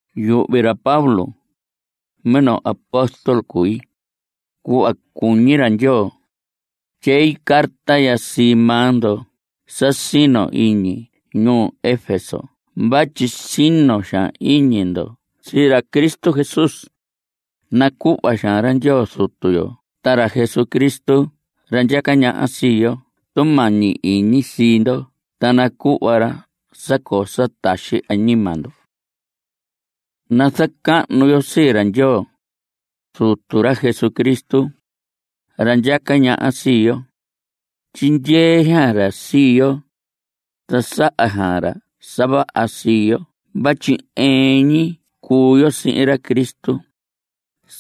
Yuhvi ra Pablo, minoo apóstol cui, cuhva cuñi ra Ndyoo. Tyei carta ya sii maa ndo sa sino iñi ñuu Efeso vatyi sino xaan iñi ndo sii ra Cristo Jesús. Nacuhva xaan ra Ndyoo Zutu yo ta ra Jesucristo ra ndyaca ñaha sii yo tumañi iñi sii ndo ta nacuhva ra sa coo sa taxi añima ndo. Nazacahnu yo sii ra Ndyoo, Zutu ra Jesucristo, ra ndyaca ñaha sii yo. Tyindyee xaan ra sii yo, ta saha xaan ra sa vaha sii yo vatyi ɨɨn ñi cuu yo sihin ra Cristo.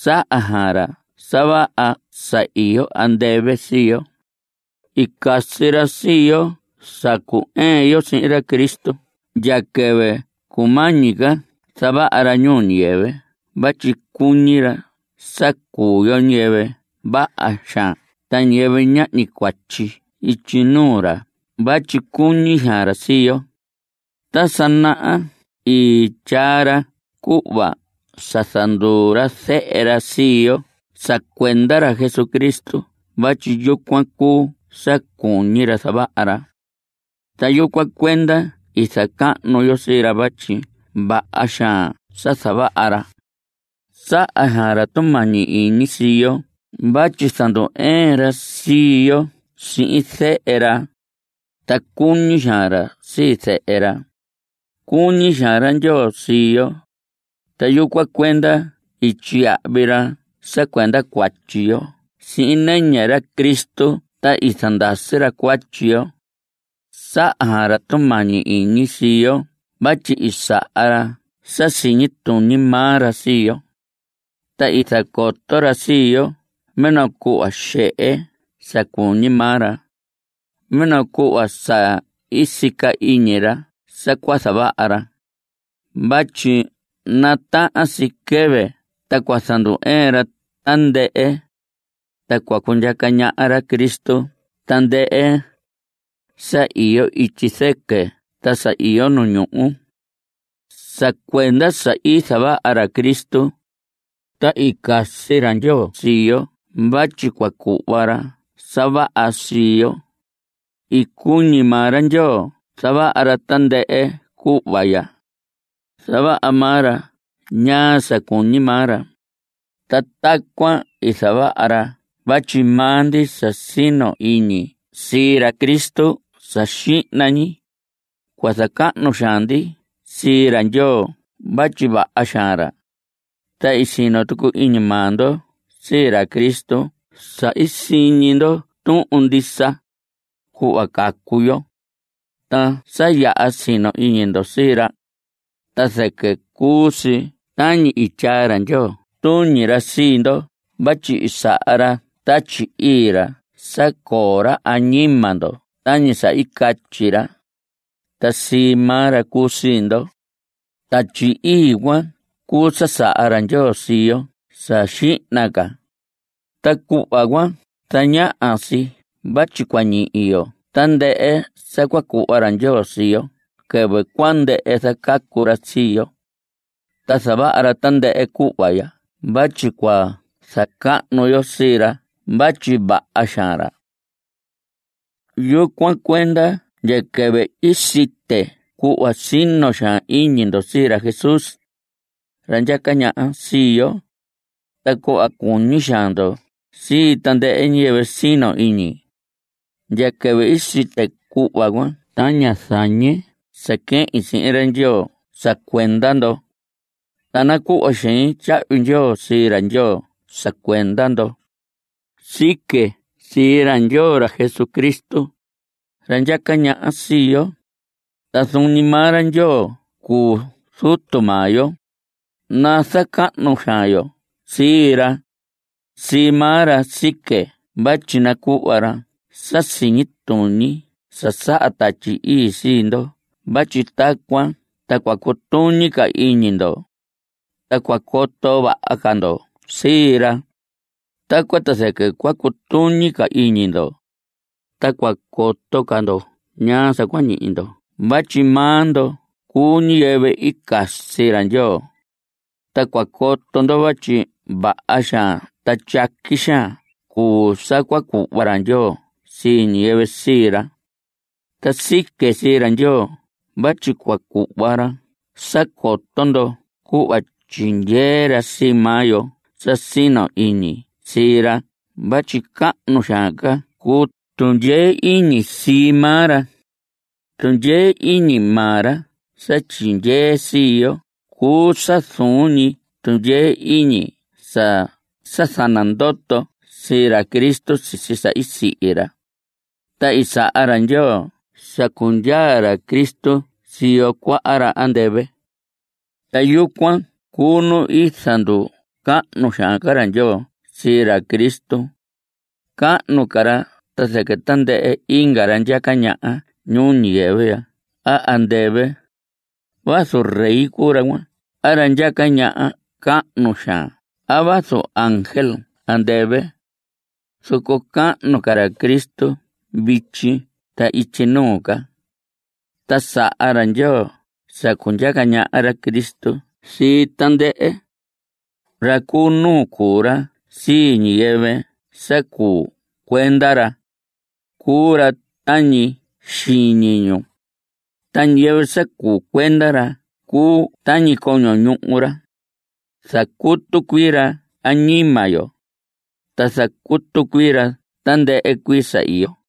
Saha xaan ra sa vaha sa iyo andɨvɨ sii yo. I casi ra sii yo sa cu‑ɨɨn yo sihin ra Cristo ndya quɨvɨ cumañi ca zavaha ra ñuu ñiyɨvɨ vatyi cuñi ra sa cuu yo ñiyɨvɨ vaha xaan ta ñiyɨvɨ ñahñi cuatyi ityi nuu ra vatyi cuñi xaan ra sii yo. Ta sa naha i tyaa ra cuhva sa zanduu ra zehe ra sii yo sa cuenda ra Jesucristo vatyi yucuan cuu sa cuñi ra zavaha ra. Ta yucuan cuenda zacahnu yo sii ra vatyi vaha xaan sa zavaha ra. Saha xaan ra tumañi iñi sii yo vatyi zandu‑ɨɨn ra sii yo sihin Zehe ra, ta cuñi xaan ra sii Zehe ra. Cuñi xaan ra Ndyoo sii yo, ta yucuan cuenda i tyiyahvi ra sa cuenda cuatyi yo sihin nɨñɨ ra Cristo ta i zandasi ra cuatyi yo. Saha xaan ra tumañi iñi sii yo vatyi i saha ra sa siñi tuñi maa ra sii yo. Ta i zacoto ra sii yo minoo cuhva xehe sa cuñi maa ra, minoo cuhva sa i sica iñi ra sa cua zavaha ra. Vatyi natahan si quɨvɨ ta cua zandu‑ɨɨn ra tandɨhɨ, ta cua cundyaca ñaha ra Cristo tandɨhɨ, sa iyo ityi zɨquɨ ta sa iyo nu ñuhu. Sa cuenda sa i zavaha ra Cristo, ta i casi ra Ndyoo sii yo vatyi cua cuhva ra sa vaha sii yo. I cuñi maa ra Ndyoo zavaha ra tandɨhɨ cuhva ya. Zavaha maa ra ñaa sa cuñi maa ra. Ta tacuan i zavaha ra vatyi maa ndi sa sino iñi sii ra Cristo sa xihna ñi, cua zacahnu xaan ndi sii ra Ndyoo vatyi vaha xaan ra. Ta i sino tucu iñi maa ndo sii ra Cristo sa i siñi ndo tuhun ndisa, cuhva cacu yo. Ta sa yaha sino iñi ndo sii ra, ta zɨquɨ cuu si tañi i tyaa ra Ndyoo tuñi ra sii ndo vatyi i saha ra Tatyi Ii ra sa coo ra añima ndo tañi sa i catyi ra, ta sii maa ra cuu sii ndo. Tatyi Ii cuan cuu sa saha ra Ndyoo sii yo sa xihna ca. Ta cuhva cuan zañaha si vatyi cua ñihi yo tandɨhɨ sa cua cuhva ra Ndyoo sii yo quɨvɨ cua ndɨhɨ zacacu ra sii yo. Ta zavaha ra tandɨhɨ cuhva ya vatyi cua zacahnu yo sii ra vatyi vaha xaan ra. Yucuan cuenda ndya quɨvɨ i site cuhva sino xaan iñi ndo sii ra Jesús, ra ndyaca ñaha sii yo, ta cuhva cuñi xaan ndo sii tandɨhɨ ñiyɨvɨ sino iñi. Ndya quɨvɨ i site cuhva cuan ta ñá zañe sa quehin sihin ra Ndyoo sa cuenda ndo. Ta nacuhva xein tyahvi ndyoo sii ra Ndyoo sa cuenda ndo. Sique sii ra Ndyoo ra Jesucristo, ra ndyaca ñaha sii yo. Ta zuun ñi maa ra Ndyoo cuu Zutu maa yo. Nazacahnu xaan yo sii ra. Sii maa ra sique vatyi nacuhva ra sa siñi tuñi sa saha Tatyi Ii sii ndo vatyi tacuan ta cua cutuñi ca iñi ndo, ta cua coto vaha ca ndo sii ra. Tacuan ta zɨquɨ cua cutuñi ca iñi ndo, ta cua coto ca ndo ñaa sa cua ñihi ndo vatyi maa ndo cuu ñiyɨvɨ i casi ra Ndyoo. Ta cua coto ndo vatyi vaha xaan ta tyaqui xaan cuu sa cua cuhva ra Ndyoo sii ñiyɨvɨ sii ra. Ta sique sii ra Ndyoo vatyi cua cuhva ra sa coto ndo cuhva tyindyee ra sii maa yo sa sino iñi sii ra vatyi cahnu xaan ca cuu tundyee iñi sii maa ra. Tundyee iñi maa ra sa tyindyee sii yo cuu sa zuun ñi tundyee iñi sa zanandoto sii ra Cristo sisi sa i sihi ra, ta i saha ra Ndyoo sa cundyaa ra Cristo siyo cuaha ra andɨvɨ. Ta yucuan cuu nu i zanducahnu xaan ra Ndyoo sii ra Cristo. Cahnu ca ra ta zɨquɨ tandɨhɨ inga ra ndyaca ñaha ñuu ñiyɨvɨ a andɨvɨ. Vazu rey cuu ra cuan a ra ndyaca ñaha cahnu xaan a vazu ángel andɨvɨ, zoco cahnu ca ra Cristo vityi ta ityi nuu ca. Ta saha ra Ndyoo sa cundyaca ñaha ra Cristo sii tandɨhɨ. Ra cu nuu cuu ra sii ñiyɨvɨ sa cuu cuenda ra. Cuu ra tañi xiñi ñu. Ta ñiyɨvɨ sa cuu cuenda ra cuu tañi coño ñuhu ra. Zacutu cuii ra añima yo, ta zacutu cuii ra tandɨhɨ cuii sa iyo.